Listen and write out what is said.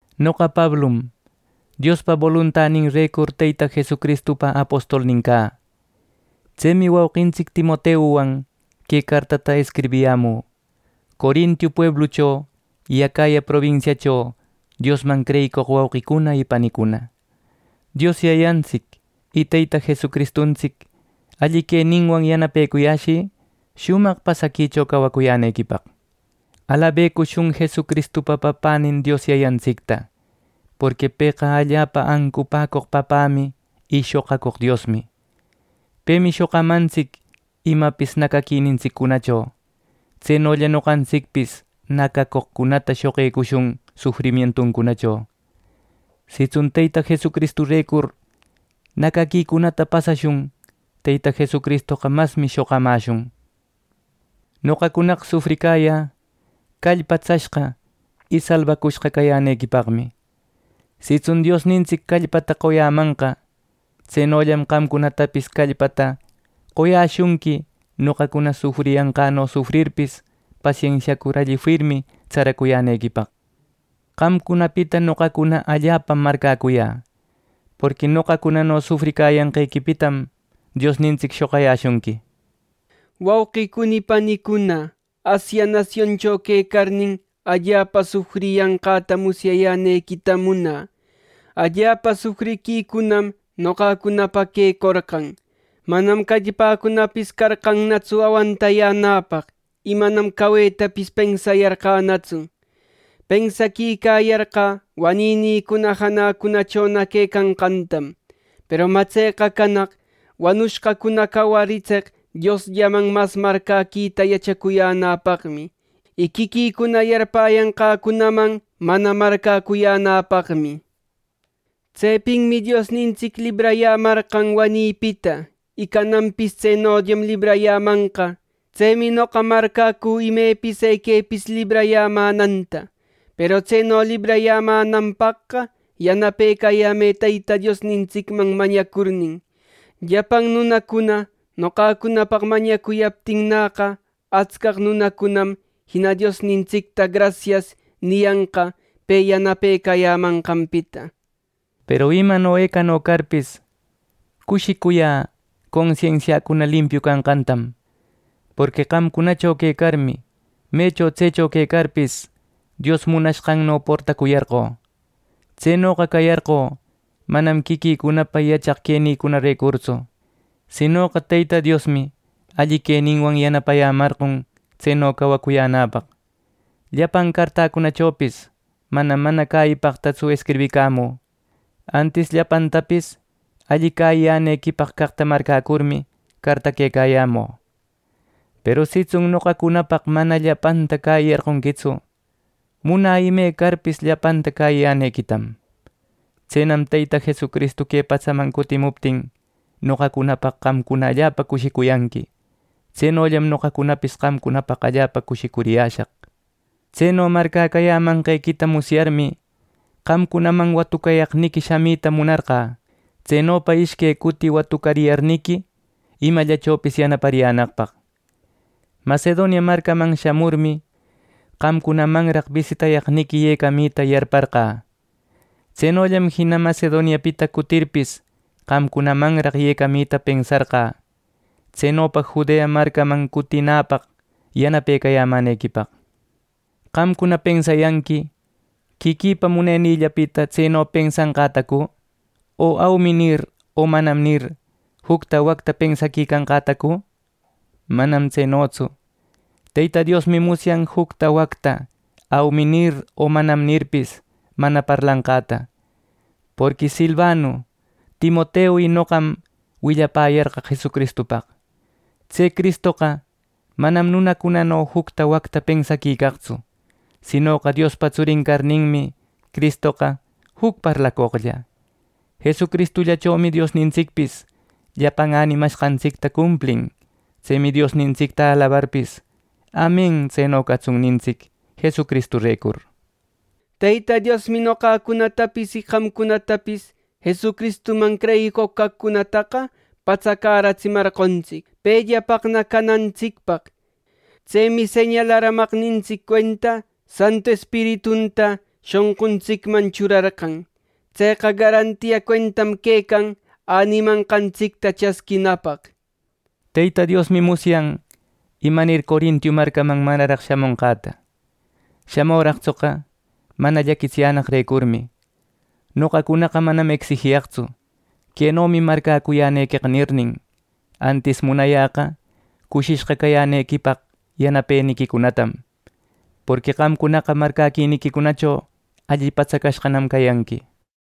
Noqa Pablum Diospa boluntaninrecur, Teyta Jesucristupa apostolnin cä. Tsemi wauqintsic Timoteuwan que cartata escribiyämü, Corinto pueblucho y Acaya probinsiacho Diosman creyicoq wauqicuna y panicuna. Dios Yayantsic y Teyta Jesucristuntsic alli queninwan yanapecuyäshï shumaq pasaquicho cawacuyänequipaq. Alabecushun Jesucristupa Papänin Dios Yayantsicta, porqui pëqa allapa ancupäcoq Papämi y shoqacoq Diosmi. Pemi shoqamantsic imapis nacaquinintsiccunacho, tsenolla noqantsicpis nacacoqcunata shoqecushun sufrimientuncunacho. Sitsun Teyta Jesucristurecur nacaquicunata pasashun; Teyta Jesucristoqa masmi shoqamäshun. Noqacunaqa sufricayä callpatsashqa y salbacushqa cayänequipaqmi. Sitsun Diosnintsic callpata qoyämanqa, tsenollam qamcunatapis callpata qoyäshunqui noqacuna sufricayanqäno sufrirpis, pasensiacur alli firmi tsaracuyänequipaq. Qamcunapita noqacuna allapam marcäcuyä, porqui noqacunano sufricayanqequipitam Diosnintsic shoqayäshunqui. Wauqicuna y panicuna, Asia nasioncho quecarnin, allapa sufriyanqäta musyayänequitam munä. Allapa sufriquicunam noqacunapaq quecorqan. Manam callpäpis carqannatsu awantanäpaq, y manam cawetapis pensarqänatsu. Pensaquicayarqä wanïnïcuna janäcunachona quecanqantam, peru mä tseqa canaq wanushqacuna cawaritseq Diosllamanna mas marcäquita yachacuyänäpaqmi, y quiquïcuna yarpäyanqäcunaman mana marcäcuyänäpaqmi. Tsepinmi Diosnintsic librayämarqan wanïpita, y cananpis tsenollam librayämanqa. Tsemi noqa marcäcü imepis equepis librayämänanta. Peru tseno librayämänanpaqqa “Yanapecayämë” Teyta Diosnintsicman mañacurnin, llapan nunacuna noqacunapaq mañacuyaptinnäqa, atscaq nunacunam jina Diosnintsicta “Grasias” niyanqa pe yanapecayämanqanpita. Peru imano ecano carpis, cushicuyä consensiäcuna limpiu canqantam. Porqui qamcunacho quecarmi, mecho tsecho quecarpis, Dios munashqanno portacuyarqö. Tsenoqa cayarqö manam quiquïcunapa yachaq quenïcunarecurtsu, sinoqa Teyta Diosmi alli queninwan yanapayämarqon tseno cawacuyänäpaq. Llapan cartäcunachopis manam mana cäyipaqtatsu escribicamü; antis llapantapis alli cäyiyänequipaq caqta marcäcurmi, cartaquecayämü. Peru sitsun noqacunapaq mana llapanta cäyiyarqonquitsu; munä imecarpis llapanta cäyiyänequitam. Tsenam Teyta Jesucristu que patsaman cutimuptin noqacunapaq qamcuna allapa cushicuyanqui. Tsenollam noqacunapis qamcunapaq allapa cushicuriyäshaq. Tseno marcäcäyämanquequita musyarmi, qamcunaman watucayaqniqui shamita munarqä; tsenopa ishque cuti watucayarniqui imallachopis yanapariyänaqpaq. Macedonia marcaman shamurmi, qamcunamanraq bisitayaqniqui yecamita yarparqä. Tsenollam jina Macedoniapita cutirpis, qamcunamanraq yecamita pensarqä, tsenopa Judea marcaman cutinäpaq yanapecayämänequipaq. ¿Qamcuna pensayanqui quiquïpa munenïllapita tseno pensanqätacu; o “Aumi” nir, o “Manam” nir, jucta wacta pensaquicanqätacu? ¡Manam tsenotsu! Teyta Diosmi musyan jucta wacta “Aumi” nir, o “Manam” nirpis, mana parlanqäta. Porqui Silvanu, Timoteu y noqam willapäyarqaq Jesucristupaq. Tse Cristoqa manam nunacunano jucta wacta pensaquicaqtsu; sinoqa Diospa tsurin carninmi, Cristoqa juc parlacoqlla. Jesucristullachomi Diosnintsicpis llapan änimashqantsicta cumplin. Tsemi Diosnintsicta alabarpis, “Amen, tseno catsun” nintsic Jesucristurecur. Teyta Diosmi noqacunatapis y qamcunatapis Jesucristuman creyicoq caqcunataqa patsacäratsimarqontsic pellapaqna canantsicpaq. Tsemi señalaramaqnintsic cuenta Santu Espiritunta shonquntsicman churarqan. Tseqa garantia cuentam quecan änimanqantsicta chasquinapaq. Teyta Diosmi musyan imanir Corinto marcaman manaraq shamonqäta. Shamüraqtsoqa mana llaquitsiyänaqrecurmi. Noqacunaqa manam ecsijiyaqtsu “Quenomi marcäcuyänequeqa” nirnin, antis munayäqa cushishqa cayänequipaq yanapeniquicunatam, porqui qamcunaqa marcäquiniquicunacho alli patsacashqanam cayanqui.